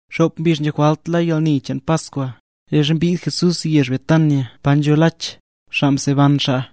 Xop mbizh nzho jwalt la yalni cheen Paskwa, leezha mbid Jesús yezh Betania pa nzho Lach, xaa mseban xaa.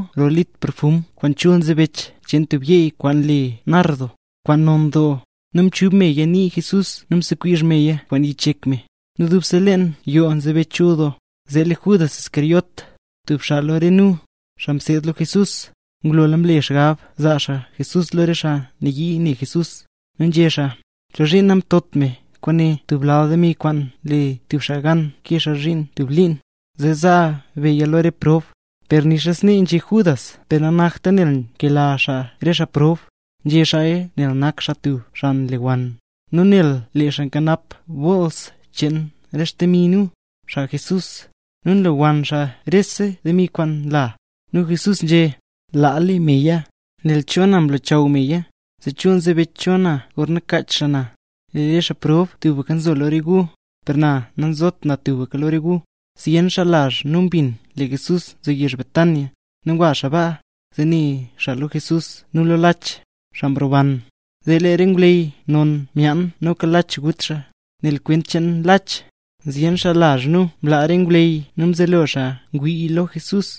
Mari mbidno rol litr perfum kwaan chul nzebech cheen tub yeey kwaan le nardo, kwaan non doo, nu mchub meya nii Jesús nu msekwizh meya kwaan yich yek me. Nu dubse leen yoo mzebech chul doo. Zee lee Judas Iscariote, tub xaa lo re nu, xaa mseed lo Jesús, ngulola mle xaa xgab zaa xaa Jesús lo re xaa nayii ne Jesús. Nu nzhé xaa: —¿Chozhiin namtot me kwaane tub lal demi kwaan nle tub xaa gan kee xaa zhiin tub liin, zee zaa beya lo re xaa prob? Per nixa snee nzhé Judas per nanakta nel nkela xaa re xaa prob, nzhé xaaya nel nak xaa tub xaa nlewann, nu nel lee xaa nkanap bools cheen re xdemi nu, xaa Jesús, nu nlewann xaa rese demi kwaan nla. Nu Jesús nzhé: —Laa le meya, nel cho na mlochaw meya, zee chul nzebech cho na gorna kaach xaa na. Lee re xaa prob tubka nzo lo re gu, per na nazot tubka lo re gu. Zyen xaa lazh nu mbin lee Jesús nzo yezh Betania, nu ngwa xaa baa, zee ne xaa lo Jesús nu lo Lach, xaa mroban. Zee lee re ngwleyy non myaan noka Lach gut xaa, nel kwent cheen Lach, zyen xaa lazh nu mlaa re ngwleyy nu mzelo xaa ngwii lo Jesús.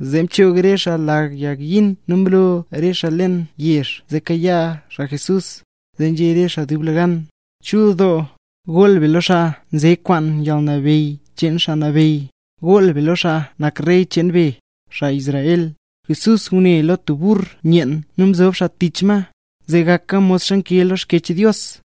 zee mchoog re xaa lag yagyin nu mroo re xaa leen yezh zee kayaa xaa Jesús, zee nzhé re xaa dublegan: —¡Chul doo! ¡Goll be lo xaa nze kwaan yalnabeyy cheen Xaa Nabeyy! ¡Goll be lo xaa nak Rey cheen be, xaa Israel! Jesús ngune lo tub burr yeen nu mzob xaa tich ma; zee gaka modxa nkee lo Xkyech Dios: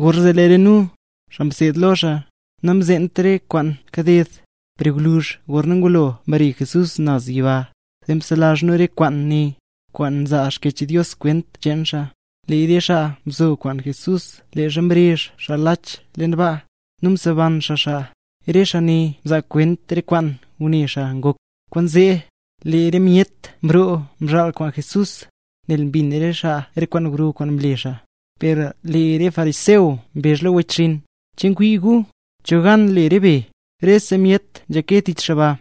Gorzee lee re nu, xaa mseed lo xaa, namzeent re kwaan kaded; per gwluzh gorna ngulo mbare Jesús naz yiba, zee mselazh nu re kwaane, kwaan nzaa Xkyech Dios kwent cheen xaa. Lee re xaa mzo kwaan Jesús leezha mrezh xaa Lach leen baa, nu mseban xaa xaa, re xaa ne mzaa kwent re kwaan ngune xaa ngok. Kwaanzee, lee re myet mroo mzhaal kwaan Jesús, nel mbin re xaa re kwaan gro kwaan mle xaa. Per lee re fariseo mbezh lo wechxinn: —¿Che ngwii gu? ¿Cho gan le re be? ¡Rese myet nzhake tich xaa ba!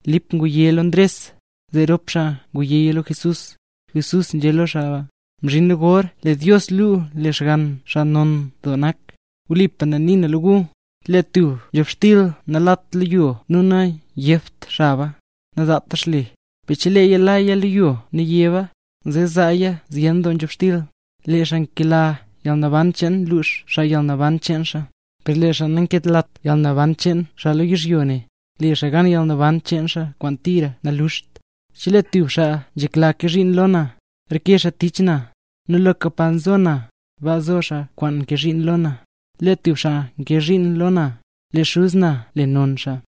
Lip ngwa nzhéya lo Ndres, zee rop xaa ngwayéya lo Jesús. Zee nzhé Jesús lo xaa: —Mzhinla gor lee Dios luu lee Xgann xaa non doo nak. Wlipa na nii na lo gu, chelee tub nzhobxtil nalat lo yo nu nayebt xaba, nazaata xle; per cheleeya laya lo yo nu yeb xaba, zeesi zaaya zyen doo nzhobxtil. Lee xaa nkela yalnaban cheen lux xaa yalnaban cheen xaa; per lee xaa nankelat yalnaban cheen xaa lo yizhyo ne, le xaa gan yalnaban cheen xaa kwaan tira naluxt. Chelee tub xaa nzhekla kee zhiin lo na, reke xaa tich na; nu loka pa zo na, baa zo xaa kwaan nkee zhiin lo na. Chelee tub xaa kee zhiin lo na, lee Xuz na le non xaa.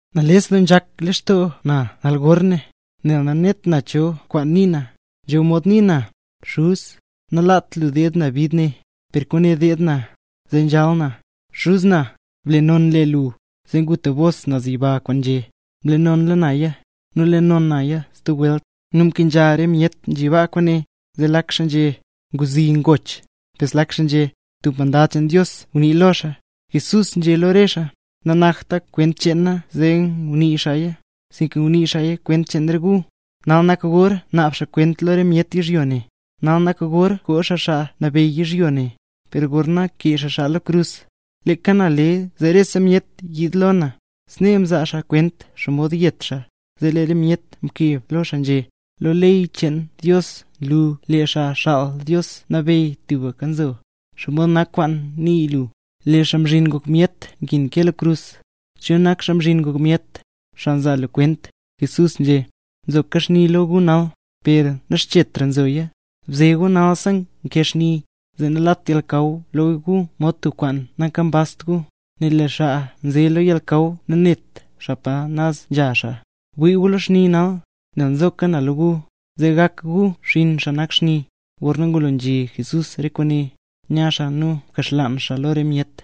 ’¡Nales doo nzhak lextoo na nal gorne! Nu nanet na cho kwaan nii na. Nzho mod nii na: “Xuz, nalat lu deed na bid ne”. ¡Per kwaane deed na, zee nzhal na! “Xuz na, ble non le lu”. Zee ngu tub bos naz yiba kwaan nzhé: —Mle nonla naya, nu le non naya stub welt. Nu mkenzha re myet nzhi baa kwaane, zee lak xaa nzhé: —Ngwzi ngoch. Per zlak xaa nzhé: —Tub mandad cheen Dios ngunii lo xaa. Jesús nzhé lo re xaa: —Nanakta kwent cheen na zee ngunii xaaya, sinka ngunii xaaya kwent cheen re gu. Nal nak gor naab xaa kwent lo re myet yizhyo ne, nal nak gor koo xaa xaa nabeyy yizhyo ne. Per gorna kee xaa na lo krus, leeka na le zee rese myet yiid lo na. Snee mzaa xaa kwent xomod yet xaa. Lee re myet mkeb lo xaa nzhé: —Lo ley cheen Dios nlu lee Xaa Xaal Dios Nabeyy tubka nzo. ¿Xomod nak kwaan nii lu, lee Xaa Mzhin Ngok Myet nkin kee lo krus? ¿Cho nak Xaa Mzhin Ngok Myet, xaa nzaa lu kwent? Jesús nzhé: —Nzoka xni lo gu nal, per naxchetra zoya. Bze gu nalsi nkee xni, zee nalat yalnakaw lo gu mod tub kwaan nankambazt gu; nel lee xaa nze lo yalnakaw nanet xaa pa naz nzha xaa. Bwii gu lo xni nal, nel nzokaya lo gu, zee gak gu xinn xaa nak xni. Gorna ngulo nzhé Jesús re kwaane, nya xaa nu mkaxlaan xaa lo re myet.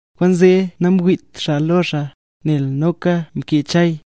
Kwaanzee namwiit xaa lo xaa, nel noka mkee Chay: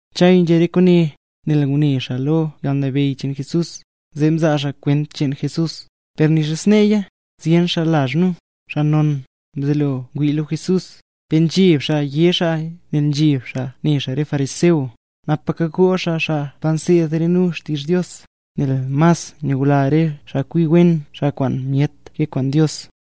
Chay nzhé re kwaane, nel ngune xaa lo yalnabeyy cheen Jesús, zee mzaa xaa kwent cheen Jesús. Per nixa sneeya, zyen xaa lazh nu, xaa non, mzelo ngwii lo Jesús, per nzheb xaa yé xaaya, nel nzheb xaa ne xaa re fariseo, napaka goo xaa xaa pa nseed re nu xtizh Dios. Nel mas nyula re xaa kwi wen xaa kwaan myet ke kwaan Dios.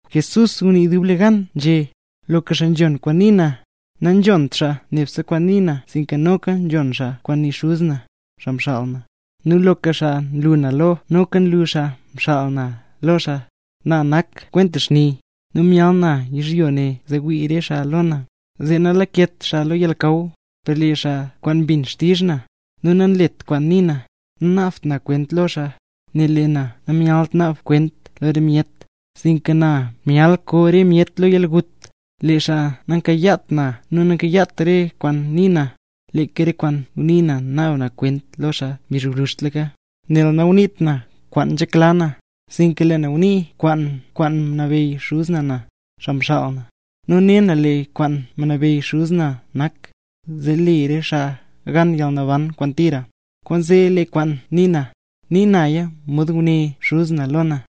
Jesús ngunii dublegan nzhé: —Loka xaa nzhon kwaan nii na, nanzhont xaa nebse kwaan nii na sinka noka nzhon xaa kwaan nii Xuz na, xaa mxaal na. Nu loka xaa nlu na lo, noka nlu xaa mxaal na lo xaa. Na nak kwenta xni, nu myal na yizhyo ne zee wii re xaa lo na, zee nalaket xaa lo yalnakaw. Per lee xaa kwaan mbin xtizh na, nu nanlet kwaan nii na, nanaabt na kwent lo xaa; nel lee na namyalt naab kwent lo re myet, sinka lee na myal koo re myet lo yalgut. Lee xaa nankayaat na nu nanlet re kwaan nii na, leeka re kwaan ngunii na naab kwent lo xaa mbizh gwluzhtlaka. Nel nanguniit na kwaan nzhekla na; sinka lee na ngunii kwaan kwaan mnabeyy Xuz na na, xaa mxaal na. Nu ne na lee kwaan mnabeyy Xuz na nak, zee le re xaa gan yalnaban kwaan tira. Kwaanzee lee kwaan nii na, nii naya mod nguné Xuz na lo na.